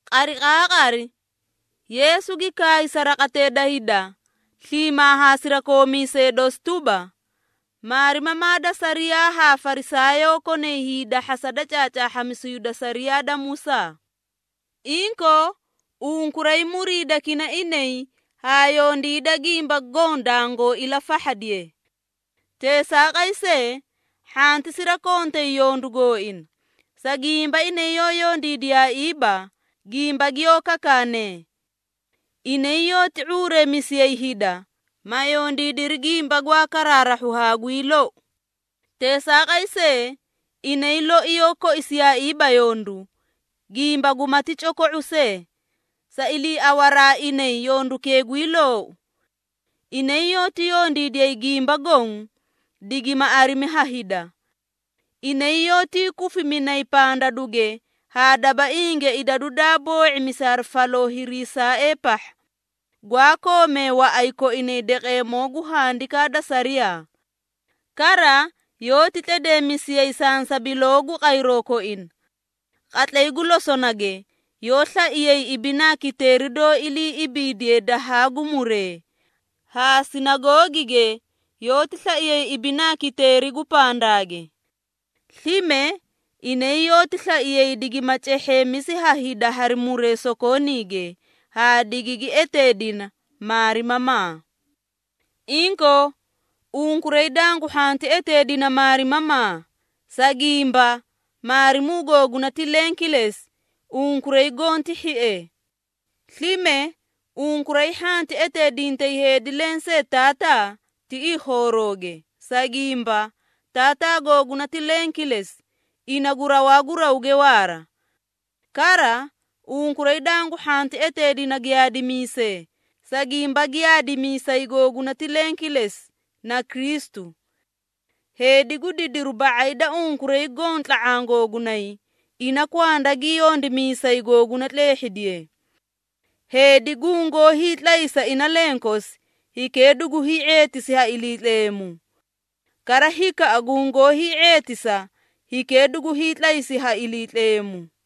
Qariqaaqari, Yeesu gi kaay sa raqatee da hida, sliimaa haa sirakoomiisee dosi tuba, “Maarimamaa da sariyaa haa Farisaayoo konay hiidahhasa da caacaahhamisu hida sariyaa da Musaa. Inkoo, unkuray muriidakina inay haa yondiida gimba goõ dangoo ilafahhadiye. Teesaaqay see, hhanti sirakontay yondu gooina, sa gimba inay yoó yondiidiyaaiiba, gimba giyoó kakaanee. Inay yoóti ⁄uureemisiyay hida, ma yondiidiri gimba gwaa karaarahhu haa gwii lou. Teesaaqay see, inay loi yoó koisiyaaiiba yondu, gimba gumati coko⁄u see, sa iliiawaraa inay yondukee gwii loou. Inay yoóti yondiidiyay gimba goõ, digima arimi ha hida. Inay yoótii kufiminay pandaduge haa dabainge idadu daa boo⁄imisi hari faloo hiriisaaee pahha, gwaa koomee waꞌay koinay daqeemoo gu handikaa da sariyaa. Kara, yoóti tledeemisiyay sansabiloo gu qayroo koina. Qatlay gu losonage, yoó slaiyay ibinaa kiteeri doó ilii ibiidiye dahaa gu muree, haa sinagoogige yoóti slaiyay ibinaa kiteeri gu pandaage. Slime, inay yoóti slaiyay digima cehheemisi ha hida hari muree sokooniige, haa digigi eteedina ‘Maarimamaa.’ Inkoo, unkuray dangu hhanti eteedina, ‘Maarimamaa,’ sa gimba, Maarimuu googuna ti leẽ kilesi, unkuray goõ ti hhiee. Slime, unkuray hhanti eteedintay heedi lensee, ‘Taataa,’ tiꞌii khoorooge, sa gimba, Taataa googuna ti leẽ kilesi, ina gu rawaa gu rawge waara. Kara, unkuray dangu hhanti eteedina ‘Giyaadimiisee,’ sa gimba Giyaadimiisay googuna ti leẽ kilesi, na Kristu. Heedi gu didiru ba⁄ay da unkuray goõ tla⁄aã googunay, ina kwanda gi yondimiisay googuna tleehhidiye. Heedi gungoó hiitlaysa ina lenkosi, hikee dugu hii⁄eetisi ha Iliitleemu. Kara hikaꞌa gungoó hii⁄eetisa, hikee dugu hiitlaysi ha Iliitleemu.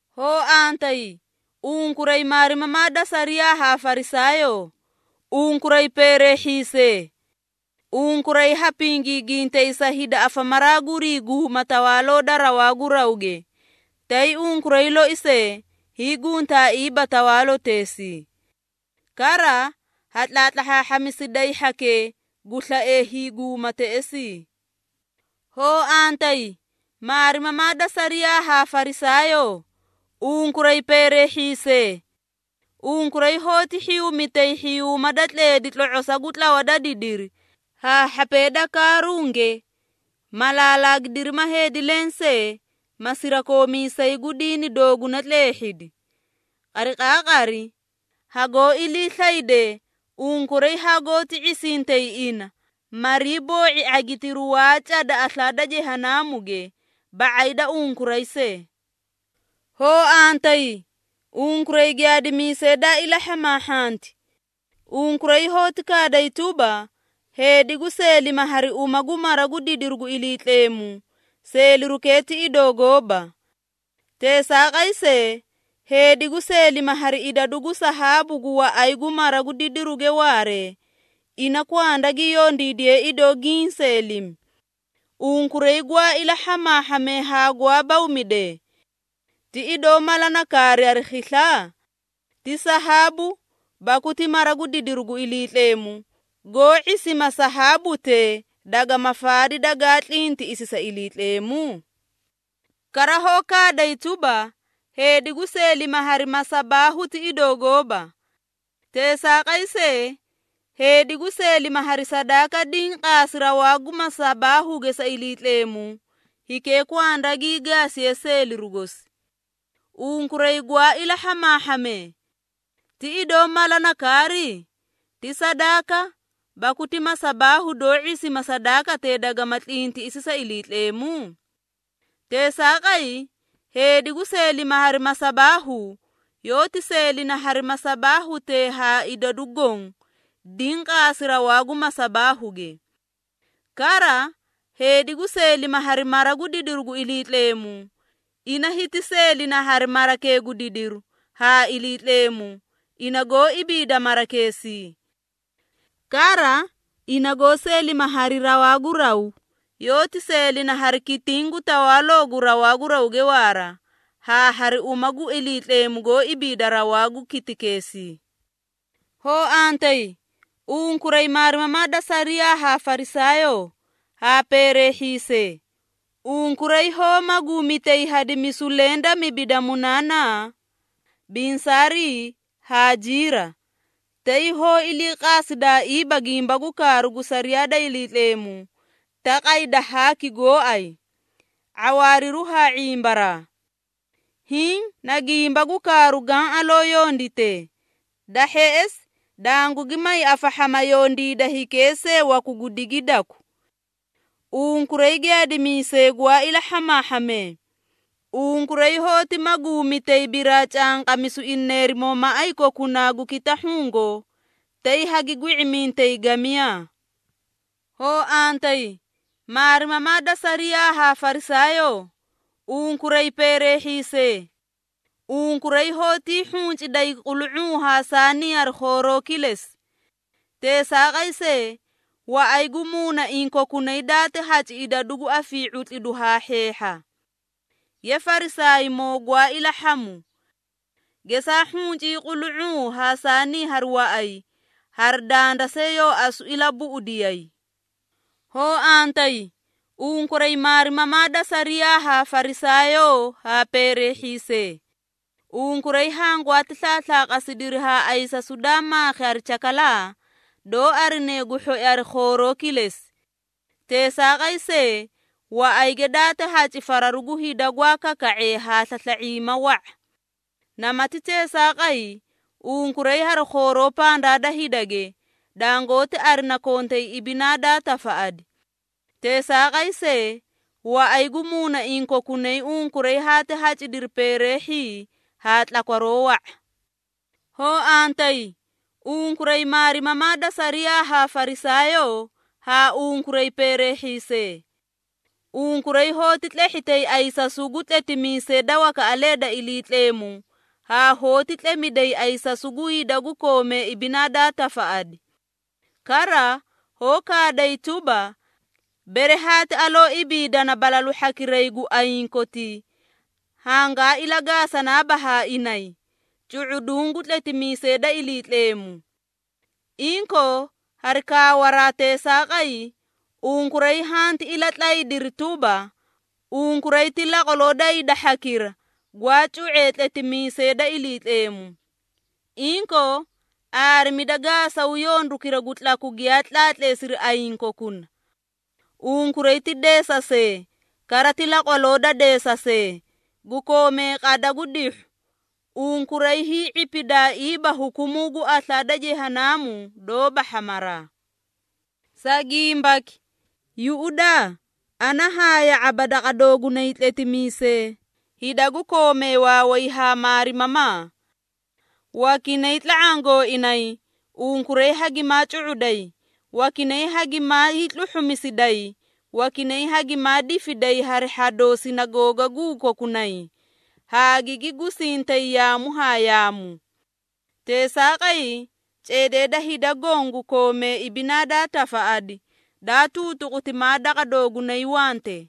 Hoo antayi, unkuray maarimamaa da sariyaa haa Farisaayoo, unkuray peereehhiisee! Unkuray ha pingiigintay sa hida afamaraa gurii guuma Tawaaloo da rawaa gu rawge, tay unkuray loi see, hiiguntaaiiba tawaaloteesii. Kara, ha tlahhaahhamisiday hhakee, gu slaee hiiguuma teꞌesii. Hoo antayi, maarimamaa da sariyaa haa Farisaayoo, unkuray peereehhiisee! Unkuray hoóti hhiyumitay hhiyuuma da tleedi tlo⁄osaa gu tlawa da didiri, haa hhapee da kaarunge, ma laalaagidiri ma heedi lensee, ma sirakoomiisay gu diini dooguna tleehhidi. Qariqaaqari hagoó iliislaydee, unkuray hagoóti ⁄isintay ina, marii boo⁄i ⁄agitiru waa cada aslaa da Jehanaamuge, ba⁄ay da unkuray see. Hoo antayi, unkuray giyaadimiisee daa ilahhamaahhanti! Unkuray hoóti kaaday tuba, ‘Heedi gu seelima hari uma gu mara gu didiru gu Iliitleemu, seelirukee ti idoo gooba. Teesaaqay see, heedi gu seelima hari idadu gu sahaabu gu waꞌay gu mara gu didiruge waaree, ina kwanda gi yondiidiye idoo giĩ seelimi.’ Unkuray gwaa ilahhamaahhamee haa gwaa bawmidee! Ti idoo mala na kaari hari khisla? Ti sahaabu, baku ti mara gu didiru gu Iliitleemu, goó ⁄isima sahaabute dagama faadi dagaa tlintiꞌisi sa Iliitleemu? Kara hoó kaaday tuba, ‘Heedi gu seelima hari masabaahu ti idoo gooba. Teesaaqay see, heedi gu seelima hari sadaaka diĩ qaasi rawaa gu masabaahuge sa Iliitleemu, hikee kwanda gii gaasiye seeliru gosi.’ Unkuray gwaa ilahhamaahhamee! Ti idoo mala na kaari? Ti sadaaka, baku ti masabaahu doó ⁄isima sadaakatee dagama tlintiꞌisi sa Iliitleemu? Teesaaqay, heedi gu seelima hari masabaahu, yoóti seelina hari masabaahutee haa idadu goõ, diĩ qaasi rawaa gu masabaahuge. Kara, heedi gu seelima hari mara gu didiru gu Iliitleemu, ina hiti seelina hari marakee gu didiru, haa Iliitleemu, ina goó ibiida marakeesii. Kara, ina goó seelima hari rawaa gu raw, yoóti seelina hari kitiĩ gu tawaaloo gu rawaa gu rawge waara, haa hari uma gu Iliitleemu goó ibiida rawaa gu kitikeesii. Hoo antayi, unkuray maarimamaa da sariyaa haa Farisaayoo, haa peereehhiisee! Unkuray hoó maguumitay hadimisu leẽ da mibi da munanaa, binsaarii haa jiira, tay hoó iliiqaasidaaiiba gimba gu kaaru gu sariyaa da Iliitleemu, taqay da haaki gooay, ⁄awaariru haa ⁄imbaraa. Hiĩ na gimba gu kaaru gaã aloo yonditee, da hheꞌesi dangugi may afahhama yondiida hikee see waku gu digidaku. Unkuray giyaadimiisee gwaa ilahhamaahhamee! Unkuray hoóti maguumitay biraacanqamisu ineerimoo maꞌay kokunaa gu kitahhugo, tay hagi gwi⁄imintay gamiyaa. Hoo antayi, maarimamaa da sariyaa haa Farisaayoo, unkuray, peereehhiisee! Unkuray hoótii hhunciday qulu⁄uu haa saanii hari khooroo kilesi. Teesaaqay see, waꞌay gu muunaiĩ kokunay daati haci idadu gu afii⁄utlidu haa hheehha. Ye Farisaaymoo gwaa ilahhamu! Gesaa hhuncii qulu⁄uu haa saanii hari waꞌay, hari danda see yoo asu ilabuꞌudiyay. Hoo antayi, unkuray maarimamaa da sariyaa haa Farisaayoo, haa peereehhiisee! Unkuray hangwati slaaslaaqasidiri haa ayisasu daa maakhi hari cakalaa, doó arine gu hhoi hari khooroo kilesi. Teesaaqay see, waꞌayge daati haci fararu gu hida gwaa kaka⁄ee haa slasla⁄iima wa⁄a. Namati teesaaqay, unkuray hari khooroo pandaa da hidage, dangoóti arina kontay ibinaa daa tafaꞌadi. Teesaaqay see, waꞌay gu muunaiĩ kokunay unkuray haati hacidiri peereehhii haa tlakwaroo wa⁄a. Hoo antayi, unkuray maarimamaa da sariyaa haa Farisaayoo, haa unkuray peereehhiisee! Unkuray hoóti tlehhitay ayisasu gu tletimiisee da wakaꞌalee da Iliitleemu haa hoóti tlemiday ayisasu gu hida gu koomee ibinaa daa tafaꞌadi. Kara, hoó kaaday tuba, ‘Bere haati aloo ibiidana balalu hhakiray gu ayiĩ kotii, hangaa ilagaasanaaba haa inay, cu⁄uduũ gu tletimiisee da Iliitleemu.’ Inkoo, hari kaawaraa teesaaqay, unkuray hanti ilatlaydiri tuba, unkuray ti laqwaloo da hida hhakira, gwaa cu⁄ee tletimiisee da Iliitleemu. Inkoo, aarimida gaasaw yondukira gu tlaku giyaa tlaatleesiri ayiĩ kokuna! Unkuray ti deesasee, kara ti laqwaloo da deesasee, gu koomee qada gu dihhu! Unkuray hii⁄ipidaaiiba hukumuu gu aslaa da Jehanaamu doóba hhamaraa. Sa gimbaki, yuꞌudaa ana haa ya⁄aba daqa doogunay tletimiisee, hida gu koomee waaway haa maarimamaa. Wakinay tla⁄aã gooinay, unkuray hagimaa cu⁄uday, wakinay hagimaa hiitluhhumisiday, wakinay hagimaa difiday hari hhadoo sinagoogaguu kokunay, haa gigi gusisintay yaamu haa yaamu. Teesaaqay, ceedee da hida goõ gu koomee ibinaa daa tafaꞌadi, daa tuutuquti maa daqa doogunay wante.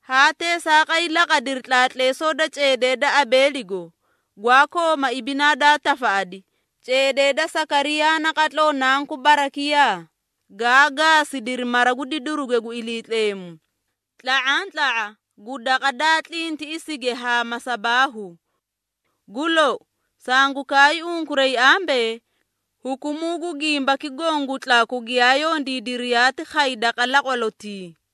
Haa teesaaqay laqadiri tlaatleesoo da ceedee da Abeeligo, gwaa kooma ibinaa daa tafaꞌadi, ceedee da Sakariyaa naqatloo nanku Barakiyaa, gaa gaasidiri mara gu didiruge gu Iliitleemu, tla⁄antla⁄a gu daqa daa tlintiꞌisige haa masabaahu. Gu lou, sangu kaay unkuray ambee, hukumuu gu gimbaki goõ gu tlaku giyaa yondiidiri yaati khay daqa laqwalotii.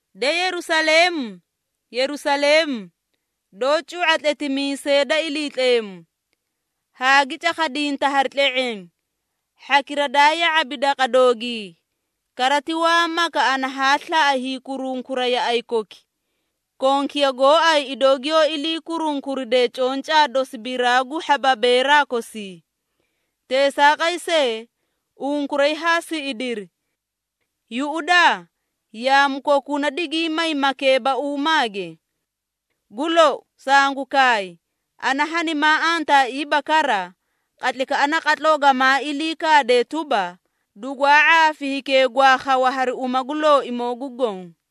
De Yerusaleemu, Yerusaleemu, doó cu⁄a tletimiisee da Iliitleemu, haa gi cakhadinta hari tle⁄eẽ, hhakira daa ya⁄abi daqa doogii! Kara ti waa maka ana haa slaꞌa hiikurunkura yaꞌay koki, konkiya gooay idoo giyoó ilii kurunkuride concaa dosi biraa gu hhababeeraa kosii. Teesaaqay see, unkuray haa siꞌidiri. Yuꞌudaa! Yaamu kokuna digiĩ may makeebauumaage. Gu lou, sangu kaay, ana hanimaa antaaiiba kara, qatlaykaꞌa naqatloo gamaa ilii kaadee tuba, ‘Dugwaa ⁄aafi hikee gwaa khawa hari uma gu Looimoo gu Goõ.’”